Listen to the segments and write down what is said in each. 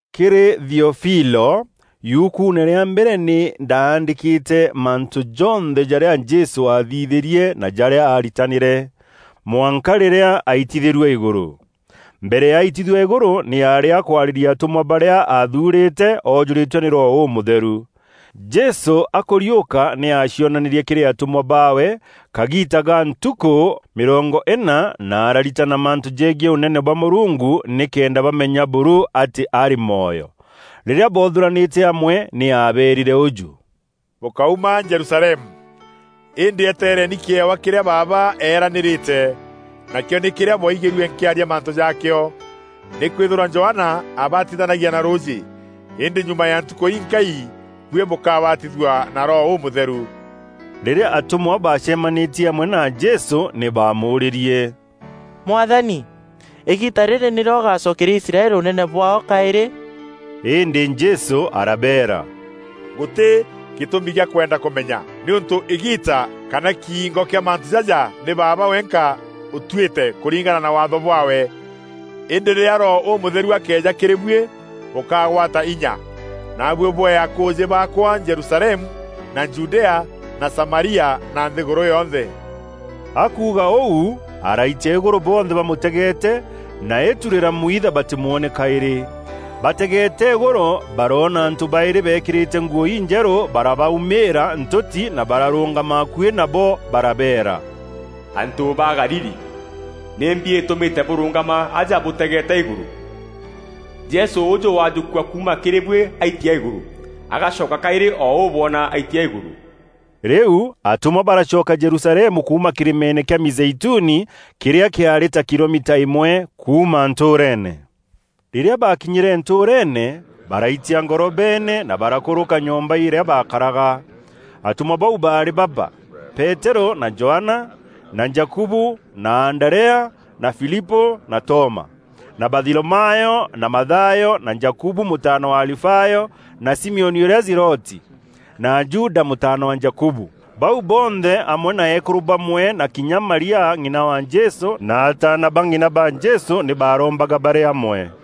Kîrî Theofilo, Yukuune rîa mbere, nî ndaandîkîre mantû jonthe jarîa Jesû aathithîrie na jarîa aaritanîre, mwanka rîrîa aitithîrue îgûrû. Mbere ya aitithua îgûrû nî aarî akwarîria atûmwa barîa aathuurîte oojûrîtwe nî Roho Ûmûtheru. Jesû akûriûka nî aacionanîrie kîrî atûmwa baawe kagiita ga ntukû mîrongo îna, na araritana mantû jegiî Ûnene bwa Mûrungu, nîkenda bamenya buru atî arî mwoyo. Rîrîa boothûranîte amwe nî aabeerîre ûjû, “Bûkáuma Jerusalemu, îndî eteereni kîewa kîrîa Baaba eeranîrîte, nakîo nî kîrîa bwaigîrue nkîaria mantû jaakîo. Nîkwîthîrwa Johana aabatithanagia na rûûjî, îndî nyuma ya ntukû inkai, buî bûkabatithua na Roho Ûmûtheru.” Rîrîa atûmwa baacemanîtie amwe na Jesû, nî baamûûrîrie, “Mwathani, îgiita rîrî nîrîo ûgacokeria Aisraeli ûnene bwaao kaîrî?” Îndî Jesû arabeera, “Gûtî gîtûmi gîa kwenda kûmenya, nîûntû îgiita kana kiingo kîa mantû jaja nî Baaba wenka ûtuîte kûringana na Waatho bwaawe. Îndî rîrîa Roho Ûmûtheru akeeja kîrî buî bûkagwata inya, naabuî bwee akûûjî baakwa Jerusalemu, na Judea na Samaria na nthîgûrû yonthe.” Akuuga ûu, araitia îgûrû bonthe bamûtegeete na îtu rîramwitha batîmwoone kaîrî. Bategeete îgûrû, baroona antû baîrî beekîrîte nguû injerû barabaumîîra ntûti na bararûngama akuî nabo barabeera, “Antû ba Galili, nîmbi îtûmîte bûrûngama aja bûtegeete îgûrû? Jesû ûûjû wajûkua kuuma kîrî buî aitia îgûrû, agacoka kaîrî o ûu bwona aitia îgûrû.” Rîu atûmwa baracoka Jerusalemu kuuma kîrîmeene kîa Mîzeituni, kîrîa kîaarî ta kilomita îmwe kuuma ntûûreene. Rîrîa baakinyîre ntûûreene, baraitia ngorobeene na barakûrûka nyomba îrîa baakaraga. Atûmwa bau baarî baba: Peterû, na Johana, na Jakubu, na Anderea, na Filipû na Toma, na Batholomeo na Mathayo, na Jakubu mûtaana wa Alifayo, na Simioni ûrîa Zeloti, na Juda mûtaana wa Jakubu. Bau bonthe amwe na eekûrû bamwe na kinya Maria ng'ina wa Jesû na ataana ba ng'ina ba Jesû nî baarombaga barî amwe.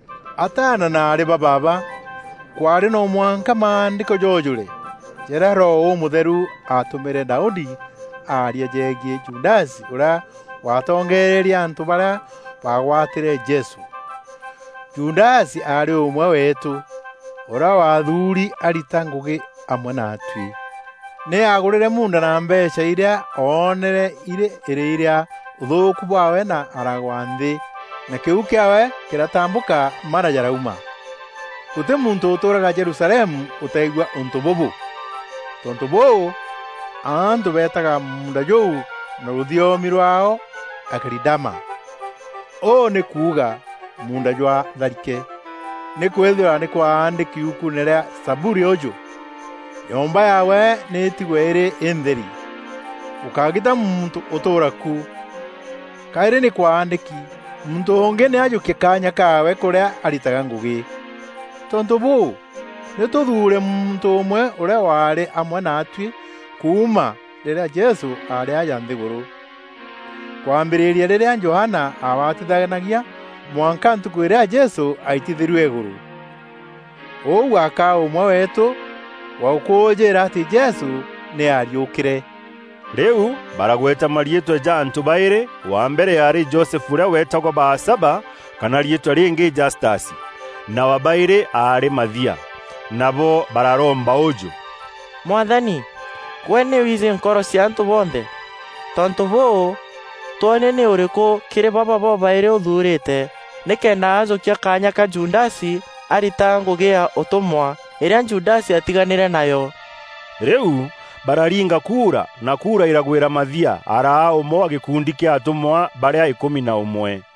“Ataana na aarî ba baaba, kwaarî no mwanka Maandîko joojûre, jarîa Roho Ûmûtheru aatûmîre Daudi aarîa jegiî Judasi ûrîa waatongeererie antû barîa baagwatîre Jesû. Judasi aarî ûmwe weetû, ûrîa waathuuri arita ngûgî amwe naatuî. (Nî aagûrîre muunda na mbeecha irîa oonere irî îrîi rîa ûthûûku bwaawe na aragwa nthî, na kîu kîaawe kîratambûka mara jaraumîra. Gûtî muntû ûtûûraga Jerusalemu ûtaigua ûntû bûbû. Tontû bûû, antû beetaga muunda jûu na rûthiomi rwaao Akelidama, ûu nî kuuga ‘Munda jwa tharike.’) Nîkwîthîrwa nî kwaandîki yukuune rîa Zaburi ûjû, ‘Nyomba yaawe nî îtigwe îrî întheri; gûkágîta muntû ûtûûra ku.’ Kaîrî nî kwaandîki: ‘Muntû ûngî nî ajûkie kaanya kaawe kûrîa aritaga ngûgî.’ “Tontû bûû, nî tûthuure muntû ûmwe ûrîa waarî amwe naatuî kuuma rîrîa Jesû aarî aja nthîgûrû, kwambîrîria rîrîa Johana aabatithanagia mwanka ntukû îrîa Jesû aitithîrue îgûrû. Ûu akaa ûmwe weetû wa gûkûûjîîra atî Jesû nî aariûkîre.” Rîu baragweta mariîtwa ja antû baîrî; wa mbere aarî Josefu ûrîa weetagwa Baasaba (Kana riîtwa rîngî Jastasi), na wa baîrî aarî Mathia. Nabo bararomba ûjû, “Mwathani, gwe nî wiijî nkoro cia antû bonthe. Tontû bûû, twonie nî ûrîkû kîrî baba bobaîrî ûthuurîte nîkenda ajûkia kaanya ka Judasi, arita ngûgî ya ûtûmwa, îrîa Judasi aatiganîre nayo.” Rîu bararinga kuura na kuura îragwîrîra Mathia, araa ûmwe wa gîkundi kîa atûmwa barîa îkûmi na ûmwe.